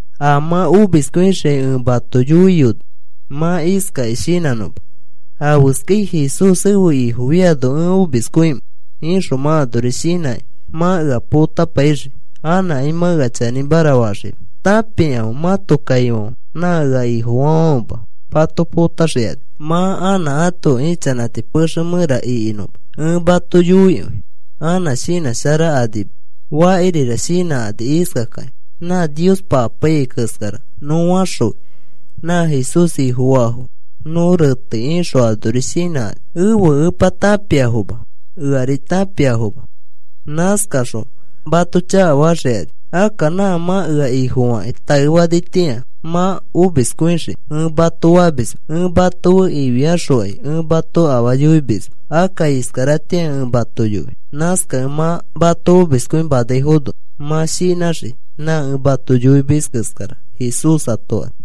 “A mã omiskõixiai ẽ mato yoiyoni mã iskakĩ shinãnõma: ‘¿Afeskai Jesús ẽfe Ifo fiano ẽ omiskõimẽ?’ ixõ mã anori shinãkĩ mã ea potapaixii, anãkai mã ea chanĩmara faxima. Tãpikãfe. Mãto kaifãfe nã ea Ifofaafãfema mato potaxikani mã anã ãto ichanãti pexe mẽra ĩkinõma. Ẽ mato yoikõi anã shinãsharakanima. Fakirira shinãkani iskakakĩ: ‘Nã Niospa apaiyai keskara nõ faxõi. Nã Jesús Ifofaafo nõ retei,’ ixõ anori shinãkani. Ẽfe Epa tãpiafoma eari tãpiafoma. Nãskakaxõ mato chakafaxikani. Akka nã mã ea Ifofakĩ taefanitĩa mã omiskõixii ẽ mato famisma, ẽ mato fe ifiaxokai ẽ mato afaa yoimisma. Akka iskaratĩa ẽ mato yoi. Nãskakẽ mã mato omiskõimanaifono mã shinãxii nã ẽ mato yoimis keskara,” Jesús ato fani.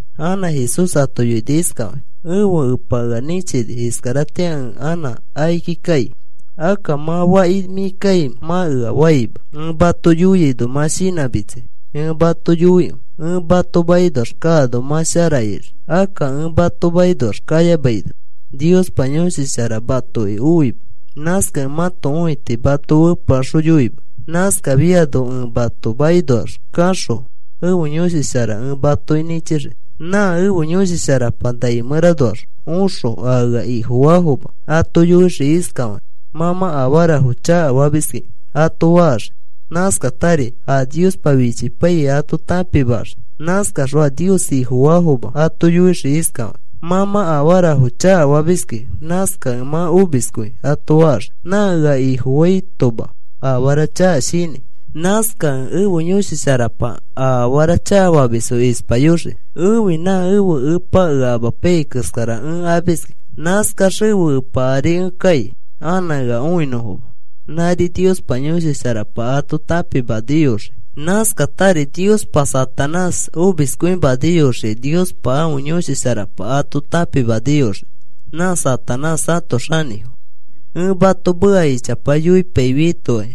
Anã Jesús ato yoini iskafakĩ: “Ẽfe Epa ea nĩchini. Iskaratĩa ẽ anã akiki kai. Akka mã, ‘¿Faki mĩ kaimẽ?’ mã ea faima. Ẽ mato yoiaino mã shinãmitsai. Ẽ mato yoikõi, ẽ mato makinoax kaano mã shara ixii. Akka ẽ mato makinoax kayamaino Niospa Yõshi Shara matoki oima. Nãskakẽ mãto õiti mato fepeaxoyoima. Nãskafiano ẽ mato makinoax kaxõ ẽfe Yõshi Shara ẽ matoki nĩchixii. Nã ẽfe Yõshi Sharapa nai mẽranoax oxõ a ea Ifofaafoma ato yoixii iskafakĩ: ‘Mã mã afarafo chakafamiski,’ ato faxii. Nãskatari a Niospa fichipaiyai ato tãpimaxii. Nãskaxõ a Nios Ifofaafoma ato yoixii iskafakĩ: ‘Mã mã afarafo chakafamiski, nãskakẽ mã omiskõi,’ ato faxii. Nã ea Ifofaitoma afara chaka shinãi. Nãskakẽ ẽfe Yõshi Sharapa a afara chakafamis ispayoxii. Ẽfi nã ẽfe Epa ea amapaiyai keskara ẽ amiski. Nãskax ẽfe Epa ari ẽ kai anã ea õinõfoma. Nãri Niospa Yõshi Sharapa ato tãpimaniyoxii. Nãskatari Niospa Satanás omiskõimaniyoxiai Niospa ãfe Yõshi Sharapa ato tãpimaniyoxii, nã Satanás ãto xanĩfo. “Ẽ mato meka ichapa yoipaifiaitokai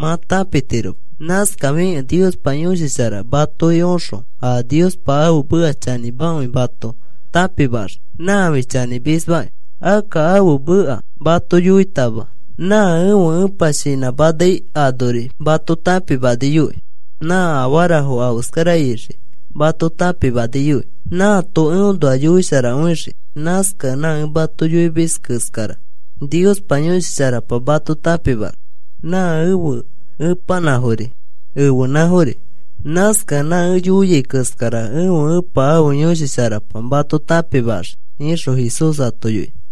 mã tãpitiroma. Nãskafikẽ Niospa Yõshi Shara matoki oxõ a Niospa ãfe meka chanĩmakõi mato tãpimaxii. Nãfi chanĩmisma. Akka ãfe meka mato yoitama nã ẽfe Epa shinãmanai anori mato tãpimaniyoi. Nã afarafo afeskara ixiai mato tãpimaniyoi. Nãato eõnoa yoisharakõixii. Nãskakẽ nã ẽ mato yoimis keskara Niospa Yõshi Sharapa mato tãpimaxii. Nã ẽfe Epanãfori ẽfenãfori. Nãskakẽ nã ẽ yoiai keskara ẽfe Epa ãfe Yõshi Sharapa mato tãpimaxii,” ixõ Jesús ato yoini.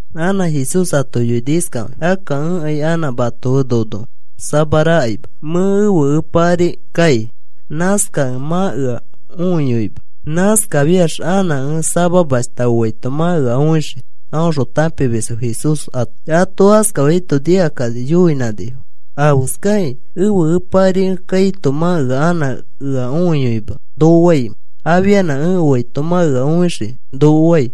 Anã Jesús ato yoini iskafakĩ: “Akka ẽkai anã mato fe nono samarakaima. Mẽ ẽfe Epa ari kai. Nãskakẽ mã ea õiyoima. Nãskafiax anã ẽ samamashta oaito mã ea õixii,” aõxõ tãpimisfo Jesús ato fani. Ato askafaito nikakani yoinãnifo: “¿Afeskakĩ, ‘Ẽfe Epa ari kaito mã anã ea õiyoima,’ noko faimẽ? ‘Afianã ẽ oaito mã ea õixii,’ noko fai.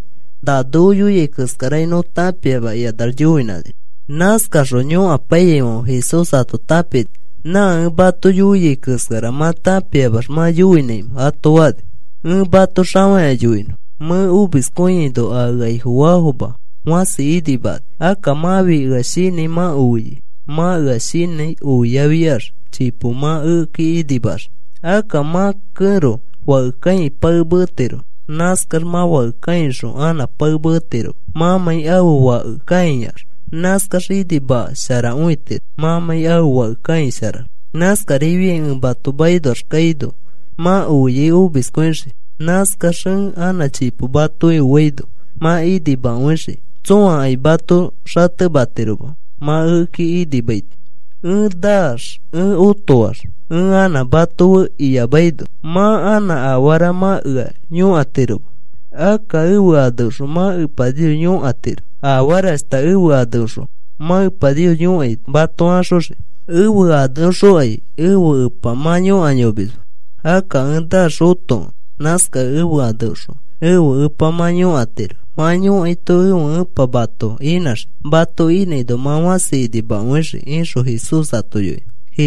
Na noko yoiai keskarakai nõ tãpiama,” ikanax yoinãnifo. Nãskakaxõ yõkapaiyaifãfe Jesús ato tãpini. “¿Na ẽ mato yoiai keskara mã tãpiamax mã yoinõnãimẽ?” ato fani. “Ẽ mato xafakĩa yoinõ. Mẽ omiskõiaino a ea Ifofaafoma fãsi inimakani. Akka mãfi ea shinãi mã oiai. Mã ea shinãi oiafiax chipo mã ekeki inimaxii. Akka mã kẽro fake kãikĩ pae metiro. Nãskax mã fake kãixõ anã pae metiroma mãmãi ãfe fake kãiax. Nãskax inimasharakõitiro mãmãi ãfe fake kãisharax. Nãskarifiai ẽ mato makinoax kaino mã oiai omiskõixii. Nãskax ẽ anã chipo matoki oaino mã inimakõixii. Tsõakai mato xatematiroma mã ekeki inimaito. “Ẽ naax ẽ otoax ẽ anã mato fe iyamaino mã anã afara mã ea yõkatiroma. Akka ẽfe aneõxõ mã Epa Nios yõkatiro. Afarashta ẽfe aneõxõ mã Epa Nios yõkaito mato axoxii. Ẽfe aneõxokai ẽfe Epa mã yõkayomisma. Akka ẽ naax otokẽ nãskakẽ ẽfe aneõxõ ẽfe Epa mã yõkatiro. Mã yõkaito ẽfe Epa mato inãxii. Mato inãino mã fãsi inimakõixii,” ixõ Jesús ato yoini.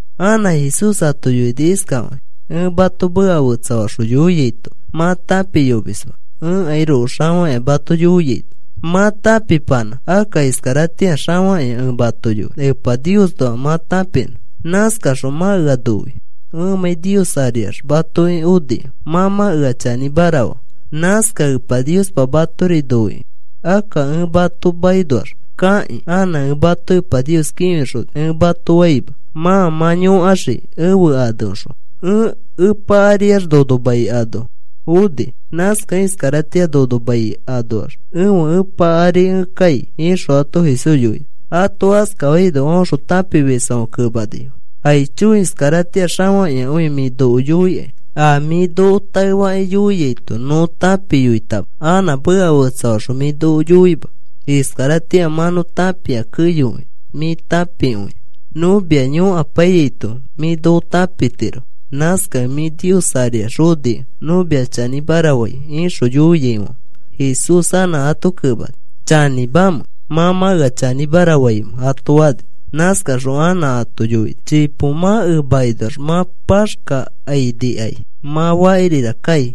Anã Jesús ato yoini iskafakĩ: “Ẽ mato meka fetsafaxõ yoiaito mã tãpiyomisma. Ẽkairoko xafakĩa mato yoiaito mã tãpipanã. Akka iskaratĩa xafakĩa ẽ mato yoi Epa Niosnoa mã tãpinõ. Nãskaxõ mã ea noi. Ẽmãi Nios ariax matoki onikẽ mã mã ea chanĩmara faa. Nãskakẽ Epa Niospa matori noikõi. Akka, ‘Ẽ mato makinoax kakĩ anã ẽ mato Epa Nios kĩfixoni,’ ẽ mato faima. Mã mã yõkaxii ẽfe aneõxõ. Ẽ Epa ariax nono mai ano oni. Nãskakẽ iskaratĩa nono mai anoax ẽfe Epa ari ẽ kai,” ixõ ato Jesús yoini. Ato askafaino aõxõ tãpimisfãfe kemanifo: “Aicho, iskaratĩa xafakĩakõi mĩ noko yoikai. A mĩ noko taefakĩ yoiaito nõ tãpiyoitama. Anã meka fetsafaxõ mĩ noko yoima. Iskaratĩa mã nõ tãpia keyokõi mĩ tãpikõia. Nõ mia yõkapaiyaito mĩ noko tãpitiro. Nãskakẽ mĩ Nios ariax onikẽ nõ mia chanĩmara fai,” ixõ yoiaifãfe Jesús anã ato kemani: “¿Chanĩmamẽ mã mã ea chanĩmara faimẽ?” ato fani. Nãskaxõ anã ato yoini: “Chipo mã emakinoax mã paxkakãinikai. Mã fakirira kai.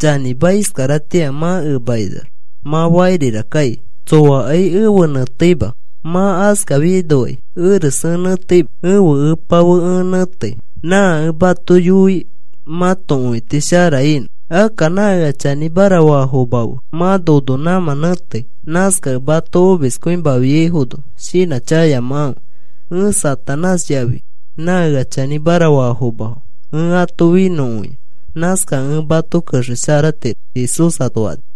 Chanĩma, iskaratĩa mã emakinoax mã fakirira kai. Tsoakai efe nẽteima. Mã askafiainokai eres ẽ nẽteima. Ẽfe Epa fe ẽ nẽtei. Nã ẽ mato yoi mãto õiti shara inõ. Akka nã ea chanĩmara faafoma fe mã nono nãmã nẽtei. Nãskakẽ mato omiskõimafiaifono shinãchakayamakãfe. Ẽ Satanás yafi nã ea chanĩmara faafomafo ẽ ato finõkõia. Nãskakẽ ẽ mato kexesharatiro,” Jesús ato fani.